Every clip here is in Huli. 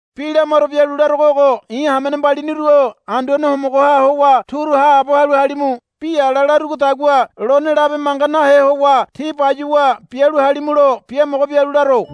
Bi lamaro bialu larogo ogo. I̱ hamene mbaliniru-o Anduane Homogoha howa turu haabo halu halimu. Bi ala larugodagua lone labe manga nahe howa tí bayuwa bialu halimulo biamogo bialu laro.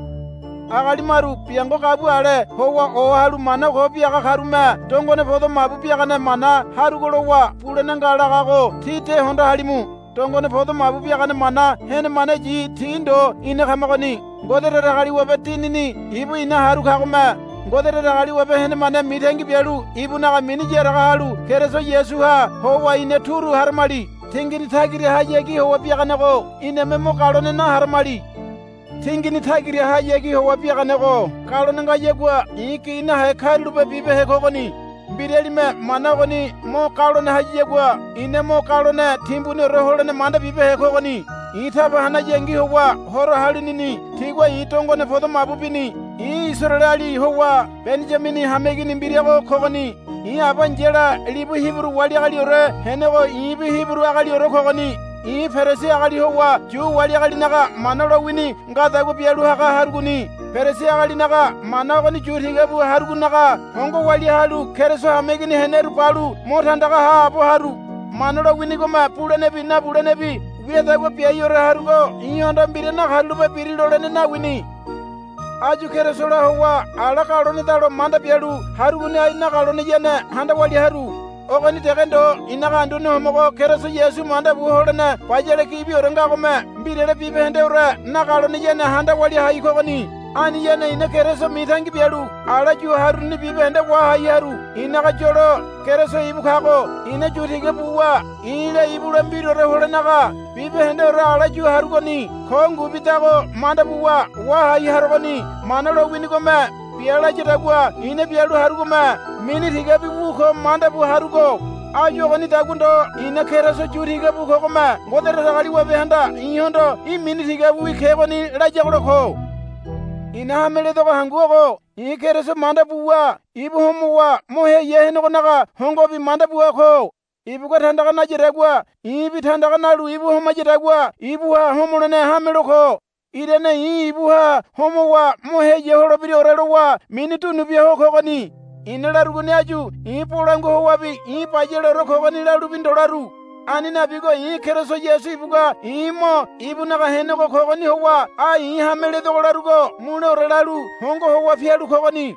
Agali maru biango gabua ale howa ohalu mana ko biaga karume dongone podo mabu biagane mana harugo lowa bulene nga lagago tí de hondo halimu. Dongone podo mabu biagane mana henemaneyi ti ndo ina kamagoni. Ngode Datagaliwabe Dinini ibu ina haru kagome Ngode Datagaliwabe henemane mitangi bialu ibunaga mini yaraga halu Keriso Yasuha howa ina turu haramali. Tingini tagirahayagi howa biaganego iname mo galone naharamali. Tingini tagirahayagi howa biaganego galone ngayagua i̱ gi nahe karulape bibehe kogoni. Mbiralime mana ogoni mo galone hayagua i̱na mo galone timbuniore holene manda bibehe kogoni. I̱ taba hanayangi howa horo halinini tigua i̱ dongone podo mabu bini. I̱ Isaraeleali howa Beniyamini hameigini mbirago kogoni. I̱ aba ai̱yala libu Hiburu wali agaliore henego i̱bi Hiburu agaliore kogoni. I̱ Perisi agali howa Yu wali agalinaga Mana lowini ngadagua bialu haga harugoni. Perisi agalinaga mana ogoni yu tiga bu harugonaga hongo walia halu Keriso hameigini heneru balu mo tandaga haabo haru. Mana lowinigome bulenebi nabulenebi wiadagua biaiore harugo i̱hondo mbira nakarulape biri lolene nawini. Áyu Kerisola howa ala galonedalo manda bialu harugoni ai nagaloneyane handa walia haru. Ogoni dege ndo i̱naga Anduane Homogo Keriso Yasu manda bu holene bayale gibiore ngagome mbirale bibahendeore nagaloneyane handa walia hai kogoni. Aniyane i̱na Keriso mitangi bialu ala yu haruruni bibahende wahai haru. I̱naga yolo Keriso ibu kago i̱na yu tiga buwa i̱la ibula mbiraore holenaga bibahendeore ala yu harugoni ko ngubidago manda buwa wahai harogoni. Mana lowinigome bia layadagua i̱na bialu harugome mini tigabi wu ko manda bu harugo. Áyu ogonidagua ndo i̱na Keriso yu tiga bu kogome Ngode Datagaliwabehanda i̱hondo, Í̠ mini tigabiwi kegoni, layagola ko. I̱na hameledogo hangu ogo i̱ Keriso manda buwa ibu homowa mo heya henegonaga hongobi manda bua ko. Ibugua tandaga nayadagua i̱bi tandaga nalu ibu homayadagua ibuha homolene hamelo ko. Irane i̱ ibuha homowa mo heya holebiraore lowa mini dunu bia ho kogoni. I̱na larugoni áyu i̱ bolangua howabi i̱ bayaleore kogoni lalubi ndo laru. Ani nabigo i̱ Keriso Yasu ibugua i̱ mo ibunaga henego kogoni howa ai i̱ hameledogo larugo muleore lalu hongo howa pialu kogoni.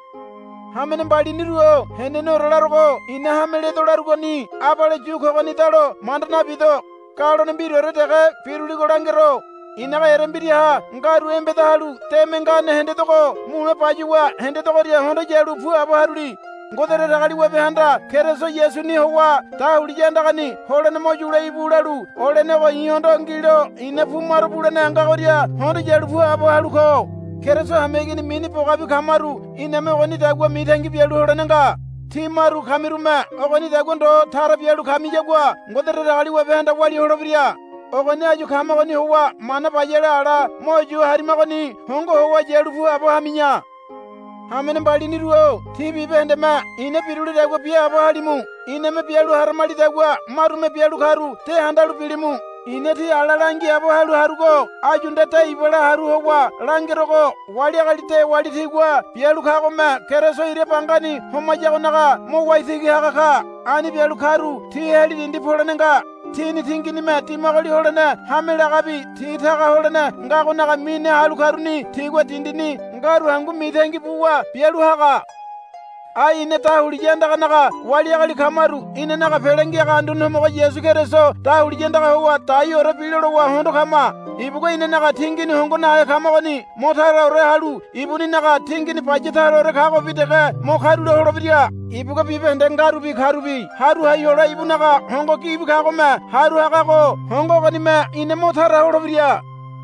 Hamene mbaliniru-o heneneore larogo i̱na hameledo larugoni abale yu kogonidalo manda nabido. Galone mbiraore dege biruligo langero. I̱naga erembiraha ngaru embeda halu deme ngane hendedogo mule bayuwa hendedogoria hondo yalu puabo haruli. Ngode Datagaliwabehanda Keriso Yasuni howa, Dahuliya andagani holene mo yule íbu, lalu olenego i̱hondo ngilo i̱na pumaro bulene ngagoria hondo yalu puabo halu ko. Keriso hameigini mini bogabi kamaru iname ogonidagua mitangi bialu holene nga. Tí maru kamirume ogonidagua ndo tara bialu kamiyagua Ngode Datagaliwabehanda walia holebira. Ogoni áyu kamagoni howa mana bayale ala mo yu harimagoni hongo howa yalu puabo hami̱ya. Hamene mbaliniru-o tí bibahendeme i̱na birulidagua biaabo halimu. Iname bialu haramalidagua marume bialu karu de handalu bilimu. I̱na tí ala langiaabo halu harugo áyu nde de ibala haru howa langerogo wali agali dewali tigua bialu kagome Keriso ira bangani homayagonaga mo waitigi haga ka. Ani bialu karu ti heli dindi polene nga. Tini tinginime dimagoli holene hame lagabi ti taga holene ngagonaga mine halu karuni tigua dindini ngaru hangu mitangi buwa bialu haga. Ai ina dahuliya andaganaga wali agali kamaru inanaga Pele Ngiaga Anduane Homogo Yasu Keriso dahuliya andaga howa daiore bilo lowa hondo kama. Ibugua inanaga tingini hongo nahe kamagoni mo taraore halu ibuninaga tingini baya taraore kagobi dege mo karula holebira. Ibugua bibahende ngarubi karubi haru hai hole ibunaga hongo gibi kagome haru hagago hongo ogonime ina mo tara holebira.